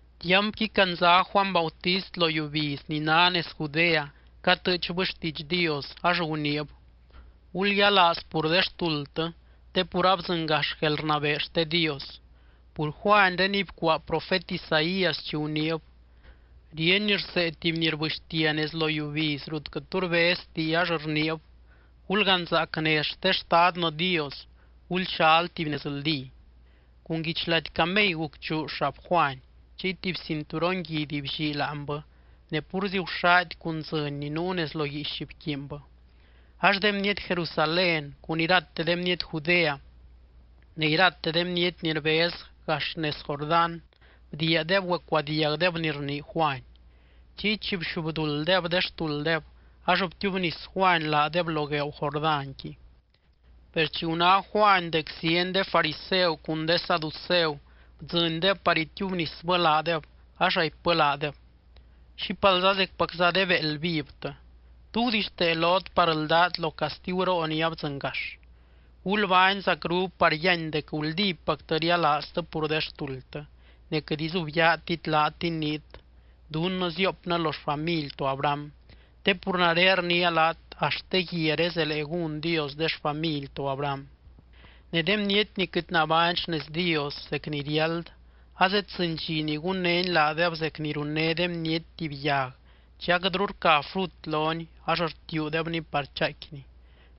Tiampqui candza Juany Bautist lo yiubiz ni ná nez Judea catɨɨchbɨ xtiidx Dios, ax guniib: —Gulyialaaz pur de xtuldtɨ te pur abdzɨngax guelrnabee xte Dios. Pur Juanréniy bcuaa profet Isaías chi guniib: Ríeny rsee tuby ni rbɨxtia nez lo yiubiz rut quɨt tu rbezti ax rniib: “Gulganzaac nez xte Xtadnɨ Dios. Gulxal tuby nezldí.” Cun guichlady camey gucchuu xab Juany, chiy tuby cinturon guidy bllii láanbɨ. Ne púrzi guxady cun dzɨny ni nuu nez lo guiix bquiinbɨ. Ax de bniety Jerusalén cun irate de bniety Judea ne irate de bniety ni rbez gax nez Jordán bdiiadeb güecuadiagdeb ni rnii Juany. Chiy chi bxubdulddeb de xtulddeb ax btiubnis Juany laadeb lo gueeu Jordánqui. Per chi guná Juany dec zieny de fariseu cun de saduceu bdzɨndeb par itiubnisbɨ laadeb, ax raipbɨ laadeb: —¡Xípalza zecpacza de béeld vivtɨ! ¿Tú gudixtee lot par ldát lo castiguroo ni abdzɨngax? Gulbány zacru par yíany dec guldípactɨ rialaaztɨ pur de xtuldtɨ, ne quɨt izubyaatit laat iniit, “Dunnɨ ziopnɨ lo xfamily to Abraham”, te pur nare rniia laat axt de guiaré zelee gún Dios de xfamily to Abraham. Ne de bniety ni quɨt nabány xnez Dios zec ni riáld, azeddzɨny dxi ni gunnény laadeb zec ni runné de bniety tuby yag chi aquɨtru rca frut loni ax rtiuudebni par chaaicquini.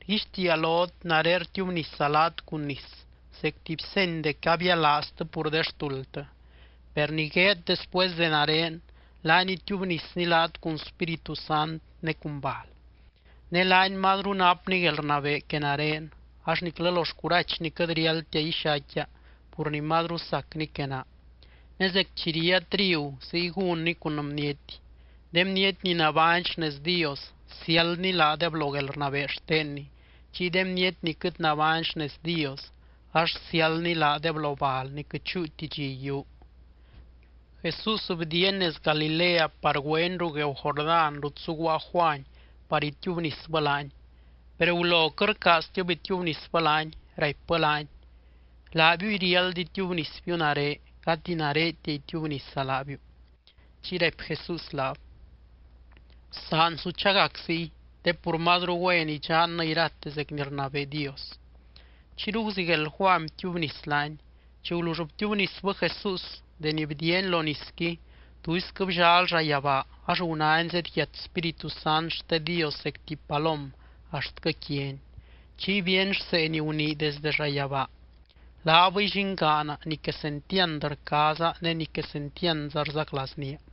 Rguixtiia lot nare rtiubnisa laat cun nis zec tuby seny dec abialaaztɨ pur de xtuldtɨ. Per ni gueed después de nare, laany itiubnisny laat cun Spíritu Sant ne cun bal. Ne laany mazru napny guelrnabee que nare, ax niclɨ lo xcurachny quɨt riáldtia ixaicquia pur ni mazru sacny que naa. Ne zec chi ría trigu ziy gúnny cun bniety. De bniety ni nabány xnez Dios siáldny laadeb lo guelrnabee xtenny, chiy de bniety ni quɨt nabány xnez Dios ax siáldny laadeb lo bal ni quɨt chúuti dxi yiuu. Jesús bdiiany nez Galilea par güeny ruu gueeu Jordán rut zuguaa Juany par itiubnisbɨ laany. Per gulo quɨt rcaaztib itiubnisbɨ laany, raipbɨ laany: —Laabiuy riáld itiubnisbiu nare, gati naretia itiubnisa laabiu. Chiy raipy Jesús laab: —Bsaan su chagac ziy, te pur mazru güen idxannɨ irate zec ni rnabee Dios. Chiyru guzigueld Juany btiubnis laany. Chi gulull btiubnisbɨ Jesús, deni bdiiany lo nisqui, tuisquɨ bllal llayabaa, ax gunány zedyiat Spíritu Sant xte Dios zec tuby palom axtquɨ quiany. Chiy bíeny rsee ni gunii desdɨ llayabaa: —Laabɨy llingaana ni quesentiand rcaaza ne ni quesentiandza rzaclaaznía.